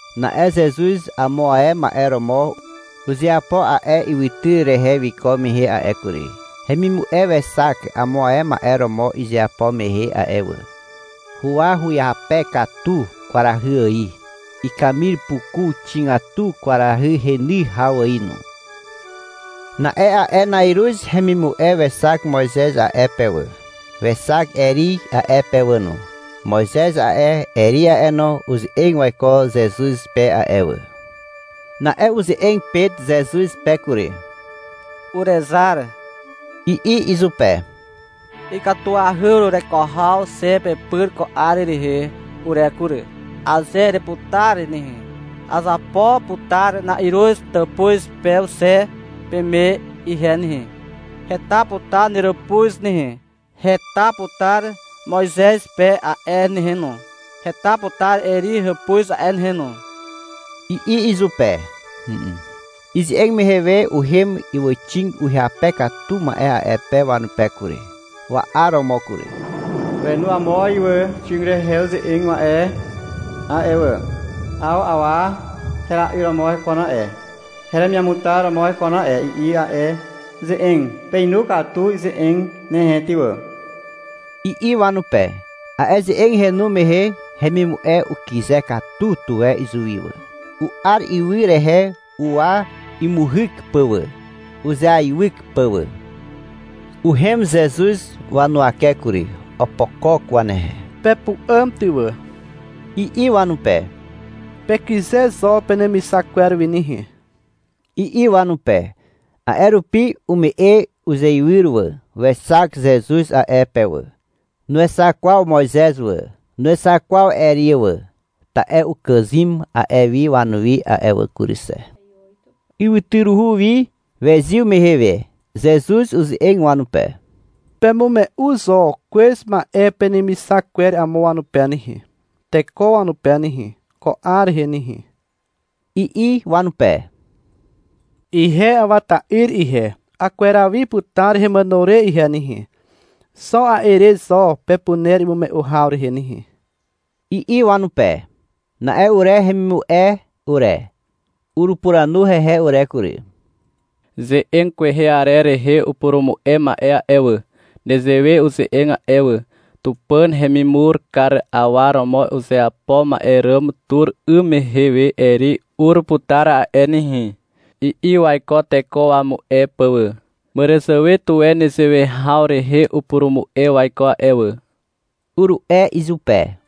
Na'e Zezuz amo ae ma'e romo uzeapo a'e ywytyr rehe wiko mehe a'e kury. Hemimu'e wexak amo ae ma'e romo izeapo mehe a'e wà. Huwa uhyape katu kwarahy ài. Ikamir puku xigatu, kwarahy heny haw ài no. Na'e a'e na'iruz hemimu'e wexak Moizez a'e pe wà. Wexak Eri a'e pe wà no. Moizez a'e, Eri a'e no, uze'eg waiko Zezuz pe a'e wà. Na'e uze'eg Pet Zezuz pe kury. — Urezar, i'i izupe. — Ikatuahy urereko haw xe pepyr ko 'ar rehe ure kury. Aze ereputar nehe, azapo putar na'iruz tàpuz pew xe peme ihe nehe. Heta putar neràpuz nehe. Heta putar Moizez pe a'e nehe no. Heta putar Eri hàpuz a'e nehe no, i'i izupe. Ize'eg mehe we uhem ywàxig uhyape katu ma'e a'e pe wanupe kury, wa'aromo kury. Wenu amo ywàxig rehe uze'eg ma'e a'e wà. — 'Aw awa hera'yr romo hekon a'e, heremiamutar romo hekon a'e, i'i a'e ze'eg. — Peinu katu ize'eg nehe ty wà, i'i wanupe. A'e ze'eg henu mehe hemimu'e ukyze katu tuwe izuwi wà. U'ar ywy rehe uwa imuhyk pà wà, uzeaiwyk pà wà. Uhem Zezuz wanuwake kury. Opokok wanehe. — Pepu'àm ty wà, i'i wanupe. — Pekyze zo penemixak kwer wi nehe, i'i wanupe. A'e rupi ume'e uzeiwyr wà. Wexak Zezuz a'e pe wà. Nuexak kwaw Moizez wà, nuexak kwaw Eri wà. Ta'e ukàzym a'e wi wanuwi a'e wà kury xe. Ywytyruhu wi wezyw mehe we Zezuz uze'eg wanupe. — Pemume'u zo kwez ma'e penemixak kwer amo wanupe nehe, teko wanupe nehe, ko 'ar rehe nehe, i'i wanupe. — Ihe Awa ta'yr ihe, akweraw wi putar hemàno re ihe nehe. Xo a'e re zo pepuner imume'u haw rehe nehe, i'i wanupe. Na'e ure hemimu'e ure, urupuranu hehe ure kury. — Ze'eg kwehe arer rehe upurumu'e ma'e a'e wà, nezewe uze'eg a'e wà. — Tupàn hemimur kar awa romo uzeapo ma'e ràm tur 'ym mehe we Eri ur putar a'e nehe, i'i waiko teko wamu'e pà wà. Màràzàwe tuwe nezewe haw rehe upurumu'e waiko a'e wà, uru'e izupe.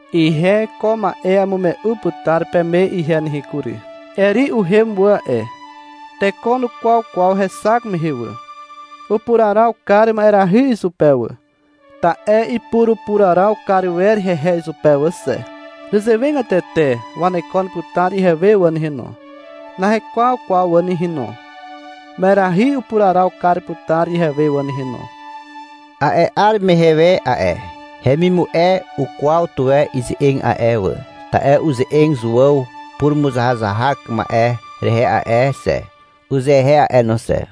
Ihe ko ma'e amume'u putar peme ihe nehe kury. — Eri uhem wà a'e. Teko nukwaw kwaw hexak mehe wà. Upuraraw kar ma'erahy izupe wà, ta'e ipurupuraraw kar wer hehe izupe wà xe. Nezewegatete wanekon putar ihewe wà nehe no. Nahekwaw kwaw wà nehe no. Ma'erahy upuraraw kar putar ihewe wà nehe no. A'e 'ar mehe we a'e hemimu'e ukwaw tuwe ize'eg a'e wà, ta'e uze'eg Zuàw purumuzahazahak ma'e rehe a'e xe, uzehe a'e no xe.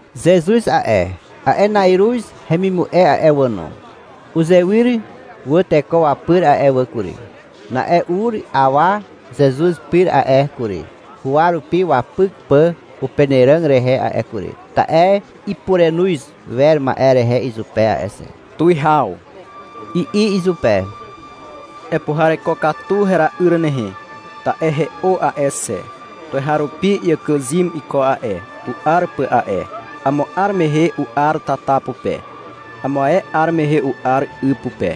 Zezuz a'e, a'e na'iruz hemimu'e a'e wà no, uzewyr wà teko wapyr a'e wà kury. Na'e ur awa Zezuz pyr a'e kury, huwa rupi wapyk pà upenàràg rehe a'e kury, ta'e ipurenoz wer ma'e rehe izupe a'e xe. — Tuwihaw, i'i izupe. — Epuhareko katu hera'yr nehe. Ta'e he'o a'e xe. Tuweharupi iàkàzym iko a'e, u'ar pà a'e. Amo 'ar mehe u'ar tata pupe. Amo ae 'ar mehe u'ar 'y pupe.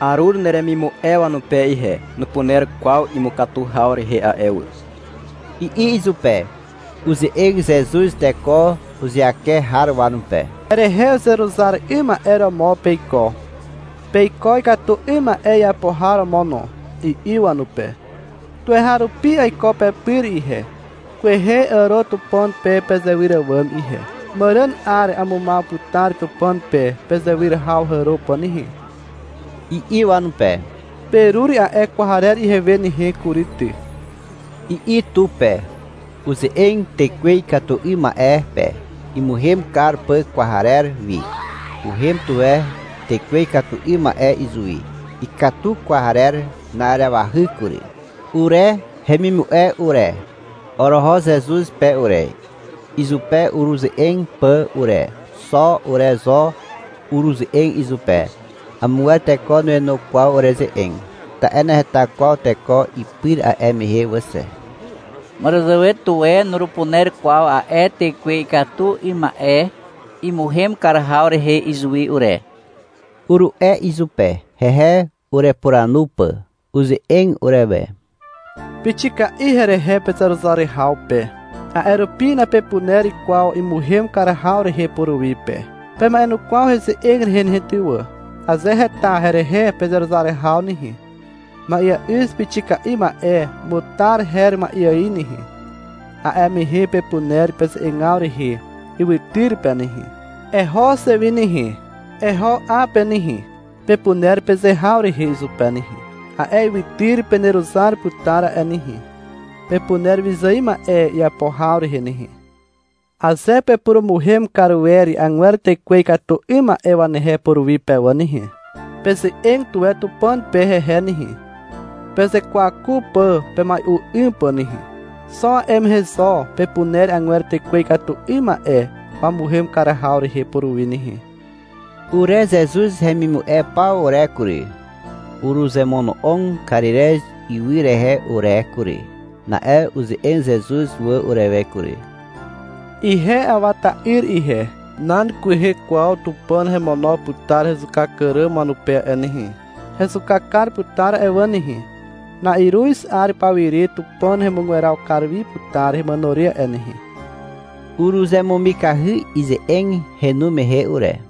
Arur neremimu'e wanupe ihe. Nupuner kwaw imukatu haw rehe a'e wà, i'i izupe. Uze'eg Zezuz teko uzeake har wanupe. — Herehe uzeruzar 'ym ma'e romo peiko, peiko ikatu 'ym ma'e iapo har romo no, i'i wanupe. — Tuweharupi aiko pepyr ihe. Kwehe àro Tupàn pe pezewyr àwàm ihe. Màràn 'ar amumaw putar Tupàn pe pezewyr haw hàro pà nehe, i'i wanupe. — Perur a'e kwarer ihewe nehe kury ty, i'i tu pe. Uze'eg tekwe ikatu 'ym ma'e pe, imuhem kar pà kwarer wi. Uhem tuwe tekwe ikatu 'ym ma'e izuwi. Ikatu kwarer na'arewahy kury. Ure hemimu'e ure, oroho Zezuz pe ure, izupe ureze'eg pà ure. (Xo ure zo uruze'eg izupe. Amogwer teko nuenu kwaw ureze'eg, ta'e naheta kwaw teko ipyr a'e mehe wà xe.) — Màràzàwe tuwe nurupuner kwaw a'e tekwe ikatu 'ym ma'e imuhem kar haw rehe izuwi ure, uru'e izupe, hehe urepuranu pà. Uze'eg urewe. — Pixika'i herehe pezeruzar haw pe, a'e rupi napepuner kwaw imuhem kar haw rehe puruwi pe. Pema'enukwaw heze'eg rehe nehe ty wà. Aze heta herehe pezeruzar haw nehe, ma'eà'yz pixika'i ma'e mutar her ma'e ài nehe, a'e mehe pepuner peze'egaw rehe ywytyr pe nehe. — Eho xe wi nehe, eho 'a pe nehe, pepuner peze haw rehe izupe nehe. A'e ywytyr peneruzar putar a'e nehe. Pepuner wyzài ma'e iapo haw rehe nehe. Aze pepurumuhem kar wer agwer tekwe ikatu 'ym ma'e wanehe puruwi pe wà nehe, peze'eg tuwe Tupàn pe hehe nehe, pezekwaku pà pemai'u 'ym pà nehe. Xo a'e mehe zo pepuner agwer tekwe ikatu 'ym ma'e wamuhem kar haw rehe puruwi nehe. Ure Zezuz hemimu'e paw ure kury, uruzemono'og Karirez ywy rehe ure kury. Na'e uze'eg Zezuz wà urewe kury. — Ihe Awa ta'yr ihe, nan kwehe kwaw Tupàn hemono putar hezuka kar àràm wanupe a'e nehe. Hezuka kar putar a'e wà nehe. Na'iruz 'ar pawire Tupàn hemugweraw kar wi putar hemàno re a'e nehe. Uruzemumikahy ize'eg henu mehe ure.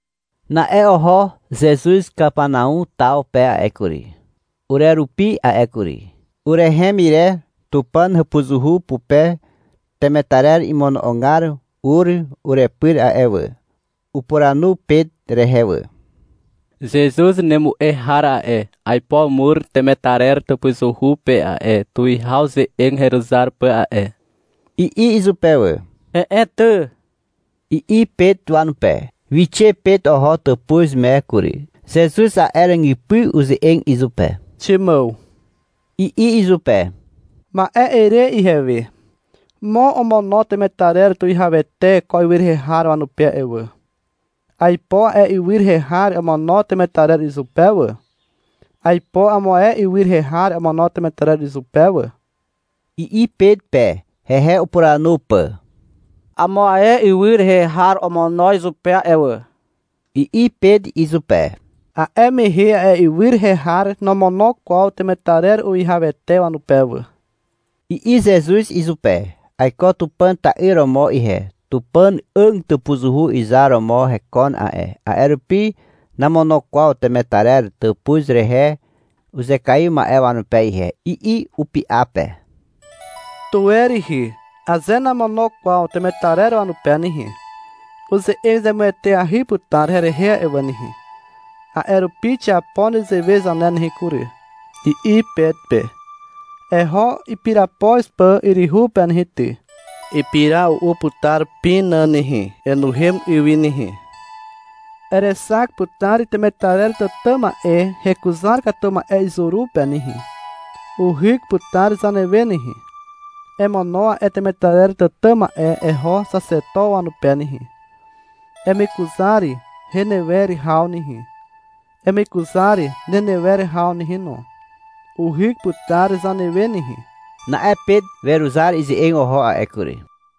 Na'e oho Zezuz Kapanau taw pe a'e kury, urerupi a'e kury. Urehem ire Tupàn hàpuzuhu pupe temetarer imono'ogar ur urepyr a'e wà. Upuranu Pet rehe wà. — Zezuz nemu'e har a'e, aipo umur temetarer tàpuzuhu pe a'e, tuwihaw ze'eg heruzar pà a'e, i'i izupe wà. — He'e ty, i'i Pet wanupe. Wixe Pet oho tàpuz me kury. Zezuz a'e ràgypy uze'eg izupe. — Ximàw, i'i izupe. — Ma'e ere ihewe. Mo omono temetarer tuwihawete ko ywy rehe har wanupe a'e wà. Aipo a'e ywy rehe har omono temetarer izupe wà. Aipo amo ae ywy rehe har omono temetarer izupe wà, i'i Pet pe, hehe upuranu pà. — Amo ae ywy rehe har omono izupe a'e wà, i'i Pet izupe. — A'e mehe a'e ywy rehe har nomono kwaw temetarer uwihawete wanupe wà, i'i Zezuz izupe. (— Aiko Tupàn ta'yr romo ihe. Tupàn 'àg tàpuzuhu izar romo hekon a'e. A'e rupi namono kwaw temetarer tàpuz rehe uzekaiw ma'e wanupe ihe, i'i upy'a pe.) — Tuwe rihi. Aze namono kwaw temetarer wanupe nehe, uze'eg zemueteahy putar herehe a'e wà nehe. A'e rupi xiapo nezewe zane nehe kury, i'i Pet pe. — Eho ipirapoz pà yryhu pe nehe ty. Ipira u'u putar pina nehe. Enuhem 'y wi nehe. Erexak putar temetarer tàtà ma'e hekuzar katu ma'e izuru pe nehe. Uhyk putar zanewe nehe. Emono a'e temetarer tàtà ma'e eho xaxeto wanupe nehe. Emekuzar henewer haw nehe, emekuzar nenewer haw nehe no. Uhyk putar zanewe nehe. Na'e Pet weruzar ize'eg oho a'e kury.